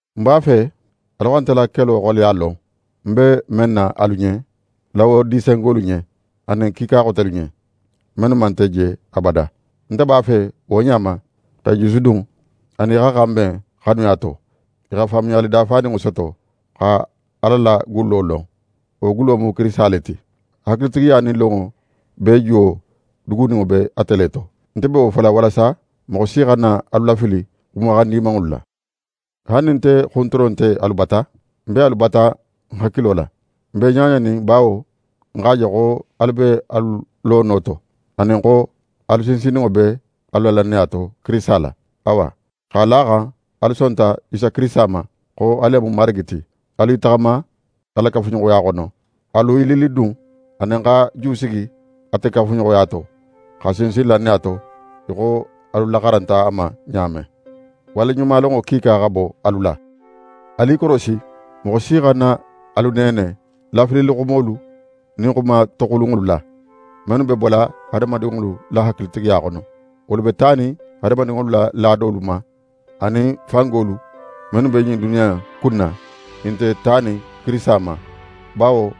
Ń b'a fe alu xa nte la kelo xoleya lon, ń be men na alu ɲen, Lawodisengolu ɲen, anin kiika xotelu ɲen, mennu man nte je abada. Nte b'a fe wo ɲa ma x'e jusudun, anin i xa xanben xanuya to, i xa faamuyali dafaninŋo soto, xa Ala la gullo lon. Wo gullo mu Kirisita le ti. Hakilitigiya nin lonŋo bee juwo duguninŋo be ate le to. Nte be wo fola walasa moxo si xana alu lafili xumaxan dimanŋolu la. Haali nin nte xunturo nte alu bata, ń be alu bata ń hakilo la. Nte be ɲaɲanin bawo ń x'a je xo alu be alu lono to, anin xo alu sinsinninŋo be alu la lannaya to, Kirisita la. Awa, x'a la a xan alu sonta Isa Kirisita ma, xo a le mu Marigi ti, alu i taxama a la kafuɲoxoya xono. Alu i lillidun anin xa jusigi ate kafuɲoxoya to, xa sinsin lannaya to, í xo alu laxaranta a ma ɲa men. Waleɲumalonŋo kiika xa bo alu la. Alu i korosi moxo si xana alu neene lafililixumolu nin xuma toxulunŋolu la, mennu be bola hadamadinŋolu la hakilitigiya xono: Wolu be tanin hadamadinŋolu la laadolu ma, anin fangolu mennu be ɲin duniya in kunna, i nte tanin Kirisita ma. Bawo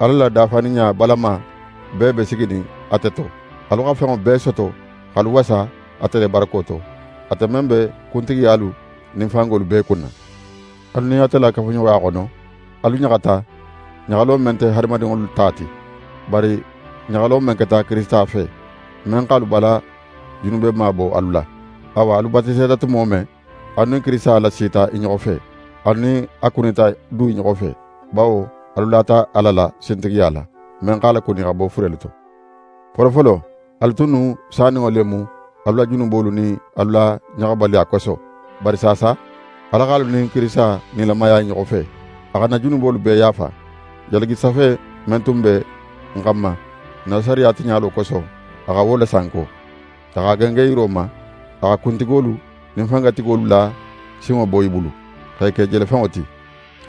Ala la dafaninɲa balama bee be siginin ate to. Alu xa fenŋo bee soto x'alu wasa ate le barako to, ate men be kuntigiyalu nin fangolu bee kunna. Alu nin ate la kafuɲoxoya xono, alu ɲaxata ɲaxalo men nte hadamadinŋolu ta ti, bari ɲaxalo men keta Kirisita fe, men x'alu bala junubema bo alu la. Awa, alu batiseta tumo men, alu nin Kirisita lasita i ɲoxo fe, alu nin a kunita du i ɲoxo fe, bawo alu lata Ala la sintigiya la, men x'a lakuni xa bo furelu to. Folofolo, alu tunnu saninŋo le mu alu la junubolu nin alu la ɲaxabaliya koso. Bari saasa, Ala x'alu nin Kirisita nilamaya i ɲoxo fe. A xa n na junubolu bee yaafa. Jalagisafe men tun be n xanma n na sariya tiɲalo koso, a xa wo lasanko. A x'a gengen yiro ma. A xa kuntigolu nin fangatigolu la sinŋo bo i bulu, x'e ke jelefenŋo ti.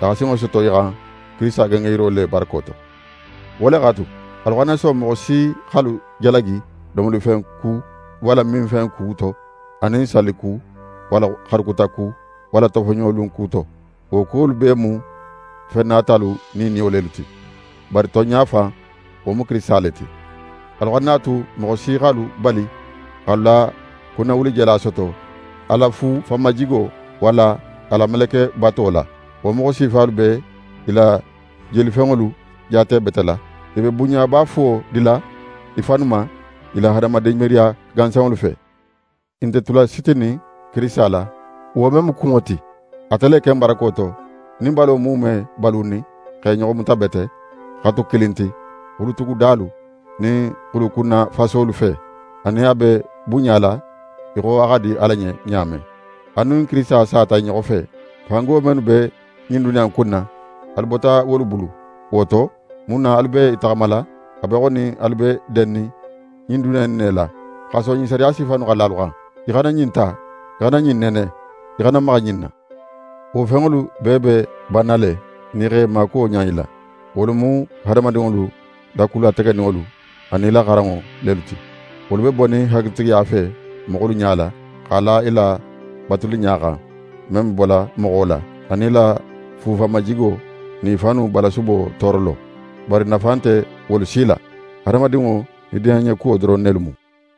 A xa sinŋo soto i xan Kirisita gengenyiro le barako to. Wo le x'a tu, alu xana son moxo si x'alu jalagi domolifen ku walla minfen ku to, anin salli ku walla xaru kuta ku, walla tofoɲolun ku to. Wo kuwolu bee mu fen natalu niiniyo lelu ti, bari tonɲa fan, wo mu Kirisita le ti. Alu xana a tu moxo si x'alu bali x'alu la kunnawulijala soto a la fu fanmajigo, walla a la melekebato la. Wo moxo sifalu be i la jelifenŋolu jaatebetela. I be bunɲaba fuwo dila i fannu ma i la hadamadin miiriya gansanŋolu fe. I nte tula sitinin Kirisita la, wo men mu kunŋo ti. Ate le ken barako to, nin balo muume be balunin x'e ɲoxo muta bete, xa tu kilin ti, xulutugudalu nin xulukunnafasolu fe, anin a be bunɲala í xo a xa di Ala ɲen ɲa men. Alu nin Kirisita sata i ɲoxo fe, fango mennu be ɲin duniya in kunna, alu bota wolu bulu. Wo to, mun na alu be i taxamala a be í xo nin alu be dennin ɲin duniya in ne la, xa son ɲin sariya sifa innu xa la alu xan: «Í xana ɲin ta», «í xana ɲin nene», «í xana maxa ɲin na»? Wo fenŋolu bee be banna le, nin i x'e maakuwo ɲan i la. Wolu mu hadamadinŋolu la ku lategeninŋolu anin i la xaranŋo lelu ti. Wolu be bonin hakilitigiya fe moxolu ɲala, x'a la i la batuliɲa xan, men be bola moxo la, anin i la fu fanmajigo nin i fannu balasubo toorolo. Bari nafa nte wolu si la. Hadamadinŋo nidiyanɲekuwo doron nelu mu.